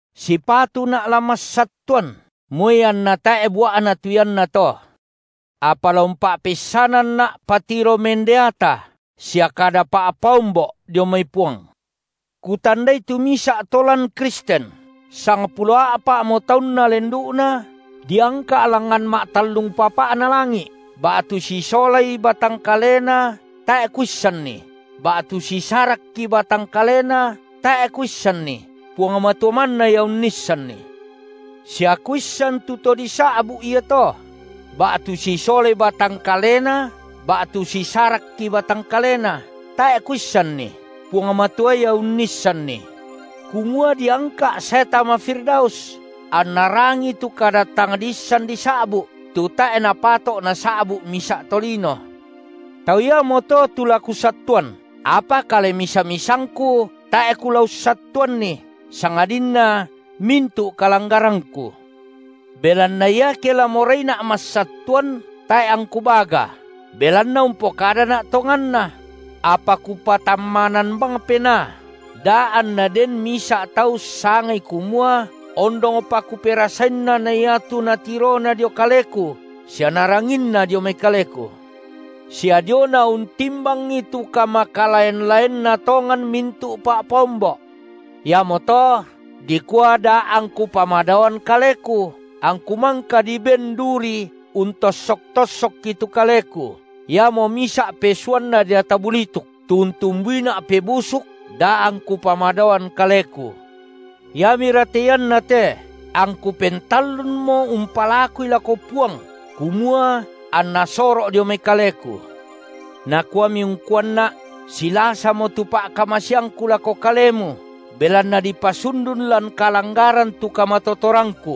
Sipatuna’ la massattuan, moi anna tae’ bua’na tu iannato. Apa la umpa’peissananna’ patiro mendeata sia kada pa’paombo’ dio mai Puang. Kutandai tu misa’ to lan Kristen, sangpulo a’pa’mo taunna lendu’na, diangka’ langngan ma’tallung papa’na langi’, ba’tu sisolai batang kalena tae’ kuissanni, ba’tu sisarakki batang kalena, tae’ kuissanni Puang Matua manna Ia unnissanni. Sia kuissan tu to disa’bu’ iato, – ba’tu sisolai batang kalena ba’tu sisarakki batang kalena, tae’ kuissanni, Puang Matua Ia unnissanni –, kumua diangka’ sae tama Firdaus, anna rangii tu kada tang diissan disa’bu’, tu tae’ napato’ nasa’bu’ misa’ tolino. Tau iamoto tu la kusattuan, apa kale misa-misangku tae’ kula ussattuanni, sangadinna mintu’ kalanggarangku. Belanna iake la moraina’ massattuan, tae’ angku baga, belanna umpokadana’ tonganna; apa kupatammanan bang penaa, da anna den misa’ tau ussangai kumua ondongpa kuperasainna na iatu natirona dio kaleku sia naranginna dio mai kaleku. Sia diona untimbangi tu kamakalaen-laenna tongan mintu’ pa’paombo’. Iamoto dikua da angku pamadaoan kaleku, angku mangka diben duri untossok-tossokki tu kaleku, iamo misa’ pesuanna deata bulituk, tu untumbuina’ pebusuk da angku pamadaoan kaleku. Iamira te iannate angku pentallunmo umpalakui lako Puang kumua anna soro’ dio mai kaleku. Nakuami ungkuanna’: Silasamo tu pa’kamaseangKu lako kalemu, belanna dipasundun lan kalanggaran tu kamatotorangKu.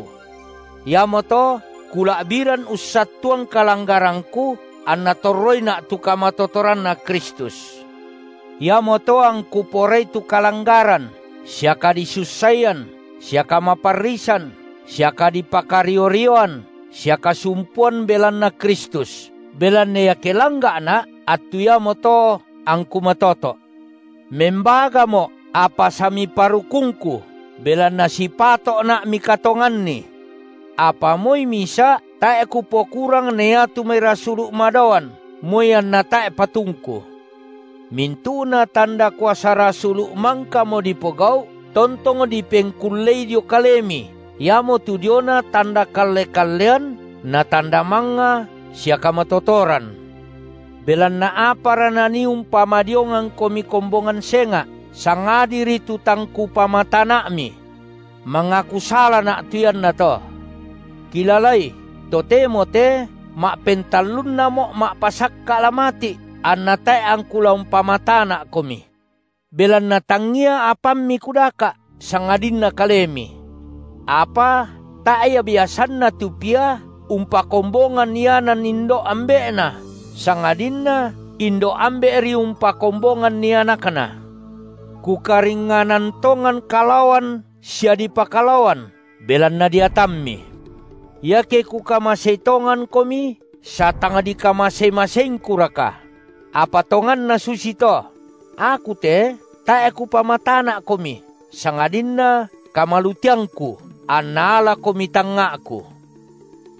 Iamoto kula’biran ussattuan kalanggarangku, anna torroina’ tu kamatotoranNa Kristus. Iamoto angku porai tu kalanggaran sia kadisussaian sia kamaparrisan sia kadipakario-rioan sia kasumpuan belanna Kristus. Belanna iake langga’na’, attu iamoto angku matoto’. Membagamo’, apa samiparukungku, belanna sipato’na mikatonganni. Apa moi misa’ tae’ kupokurang na iatu mai rasulu’ madaoan, moi anna tae’ patungku. Mintu’na tanda kuasa rasulu’ mangkamo dipogau’ tontong dipengkullei dio kalemi iamotu diona tanda kalle-kallean na tanda mangnga sia kamatotoran. Belanna apara nanii umpadiongangkomi kombongan senga’, sangadiri tu tang kupamatana’mi. Mangaku salana’ tu iannato. Kilalai, totemo te ma’pentallunnamo’ ma’pasakka’ la mati’, anna tae’ angku la umpamatana’komi. Belanna tangngia apammi kudaka’, sangadinna kalemi. Apa tae’ ia biasanna tu pia umpakombongan ianan indo’ ambe’na, sangadinna indo’ ambe’ri umpakombonganni anakna. Kukaringnganan tongan kalaoan sia dipokalaoan belanna deatammi. Iake kukamasei tongankomi, satangdikamase-maseingkuraka? Apa tonganna susito: aku te tae’ kupamatana’komi, sangadinna kamaluteangku, anna alakomi tangnga’ku.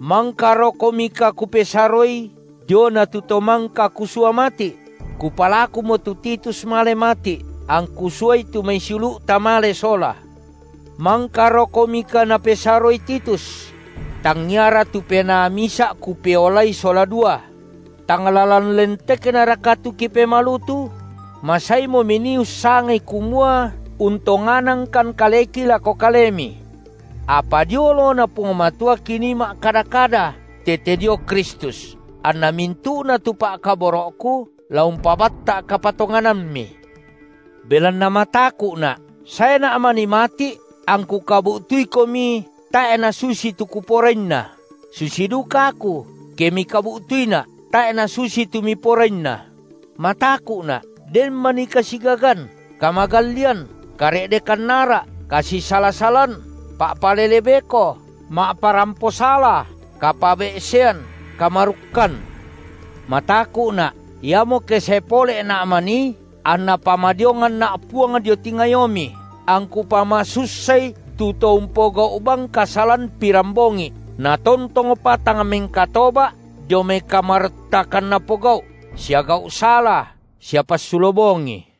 Mangkarokomika kupesaroi diona tu to mangka kusua mati’? Kupalakumo tu Titus male mati’, angku suai tu mai siulu’ta male sola. Mangkarokomika napesaroi Titus? Tangiaraka tu Penaa misa’ kipeolai sola dua? Tang lalan lenteknaraka tu kipemalutu? Masaimo minii ussangai kumua untonganangkan kaleki lako kalemi. Apa dio oloNa Puang Matua kinii ma’kada-kada tete dio Kristus, anna mintu’na tu pa’kaboro’ku, la umpabatta’ kapatonganammi. Belanna mataku’na’ saena’ manii mati’ angku kabu’tuikomi, tae’ nasusi tu kuporainna, susi duka aku, ke mikabu’tuina’, tae’ nasusi tu miporainna; mataku’na’ den manii kasigagan, kamagallian, kare’dekan ara’, kasisala-salan, pa’palele beko, ma’parampo sala, kapabe’sean, kamarukkan. Mataku’na’, iamo ke sae pole’na’ manii, anna pamadionganna’ Puang dio tingayomi, angku pamasussai tu to umpogau’ bang kasalan pirambongi’, natontongpa tang mengkatoba’ dio mai kamaruttakan napogau’ sia gau’ sala sia passulo bongi.